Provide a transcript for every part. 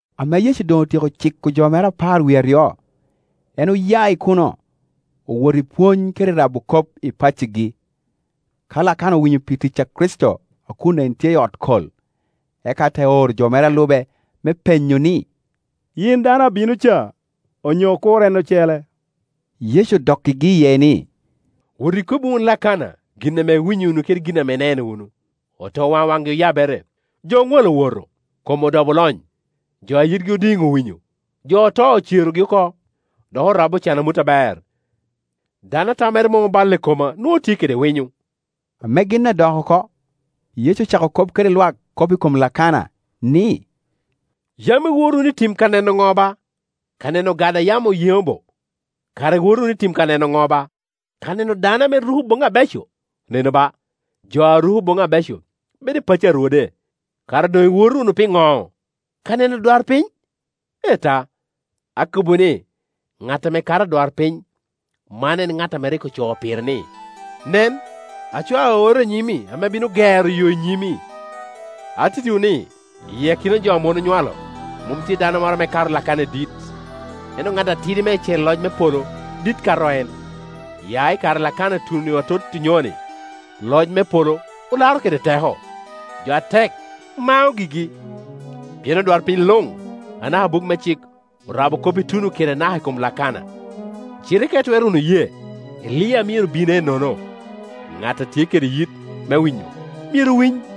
Ame Yecu doŋ otyeko ciko jo mere apar wie aryo, en oya i kuno, owoto i pwony kede i rabo kop i paccigi. Ka Lakana owinyo pi tic a Kricito a kun en tye i ot kol, eka te ooro jo mere a lube me penyo ni, “Yin dano abino ca, onyo okur en ocele?” Yecu odokkigi iye ni, “Wot ikobbi wunu Lakana gin ame iwinyo wunu kede gin ame ineno wunu: otowaŋ waŋgi oyabere, jo oŋwalo owoto, kom odobo olony, jo a yitgi odiŋ owinyo, jo oto ocerogi oko, dok orabbi ocan amut aber. Dano a tammere mom oballe i koma nwoŋo tye kede winyo.” Ame gin adok oko, Yecu ocako kop kede lwak kop i kom Lakana, ni, “Yam iwoto wunu i tim ka neno ŋo ba? Ka neno ogada a yamo yeŋo bo? Kara iwoto wunu ka neno ŋo ba? Ka neno dano ame ruko boŋi abeco? Nenu ba, jo a ruko boŋi abeco bedo i pacci a rwode. Kara doŋ iwoto wunu piŋo? Ka neno adwarpiny? Ee ta, akobbiwu ni, ŋat ame kato adwarpiny. Man en ŋat a rik ocoo pire ni, ‘Nen, acwao aorra i nyimi, ame bino gero yo i nyimi.’ Atittiwu ni, i akina jo ame mon onywalo, mom tye dano moro ame kato Lakana i dit; ento ŋat atidi meicel i loc me polo dit kato en. Ya i kare a Lakana ituno atot onyoni, loc me polo olaro kede teko, jo atek mao gigi. Pien odwarpiny luŋ anaka buk me cik orabo kop ituno kede naka i kom Lakana; cite ka itwero wunu ye, Elia a myero bin ennono, ŋat a tye kede yit me winyo, myero winy.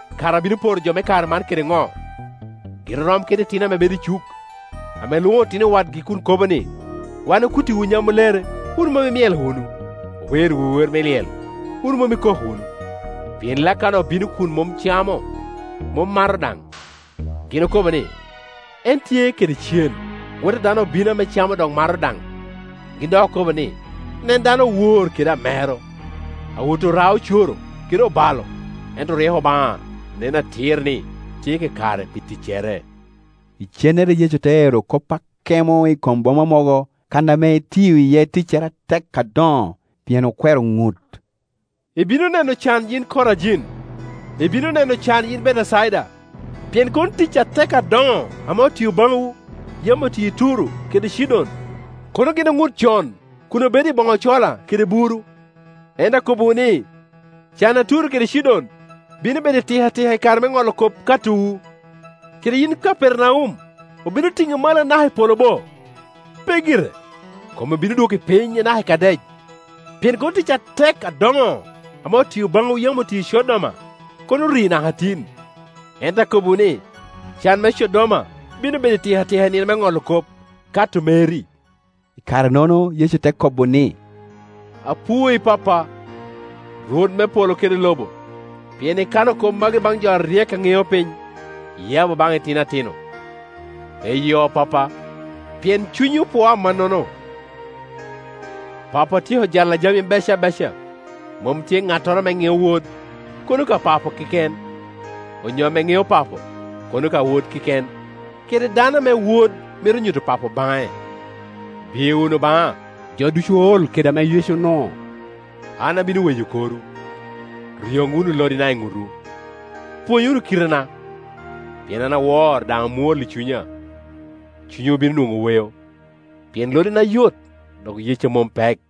“Kara abino poro jo me kare man kede ŋo? Gin orom kede itino ame bedo i cuk, ame lwoŋo otino wadgi kun okobo ni, ‘Wan okuttiwu nyamulere, wun mom imyelo wunu; owerriwu wer lyel, wun mom ikok wunu’. Pien Lakana obino kun mom camo, mom mato daŋ, gin okobo ni, ‘En tye kede cen’. Wot a dano obino ame camo dok mato daŋ, gin dok okobo ni, ‘Nen dano owor kede amero, awot ora-ocoro kede obalo.’ Ento ryeko Obaŋa nen atir ni tye kakare pi ticcere.” Icennere Yecu te ero kop akemo i kom boma mogo kan ame etio iye ticcere atek adoŋo, pien okwero ŋut. “Ibino neno can, yin Korajin! Ibino neno can, yin Betecaida! Pien kono tic atek adoŋo ame otio baŋwu, yam otio i Turo kede Cidon, kono gin oŋut con kun obedo i boŋo cola kede buru. Ento akobbiwu ni, can a Turo kede Cidon bino bedo itikatika i kare me ŋolo kop, katowu. Kede yin Kapernaum, obino tiŋi malo anaka i polo bo? Pe gire; kom obino dwoki piny naka i Kadec. Pien kono tic atek adoŋo ame otio baŋwu yam otio i Codoma, kono ori naka tin. Ento akobbiwu ni, can me Codoma bino bedo itikatika i nino me ŋolo kop, kato meri.” I kare-nono Yecu te kobo ni, “Apwoyi Pappa, Rwot me polo kede lobo, pien ikano kop magi baŋ jo aryek a ŋeo piny, iyabo baŋ itino atino. Eyo, Pappa, pien cunyi opwoo amannono. Pappa otyeko jalla jami bec abeca; mom tye ŋattoro ame ŋeo Wod, kono ka Papa keken, onyo ame ŋeo Papo kono ka Wod keken, kede dano ame Wod mito nyuto Papo baŋe. Biye wunu baŋa jo ducu ool kede ame yee onuo, an abino weyo korwu. Ryoŋ wunu lodina i ŋutwu, pwony wunu kitena; pien an awor, daŋ amwol i cunya, cunywu bino nwoŋo weo. Pien lodina yot, dok yecca mom pek.”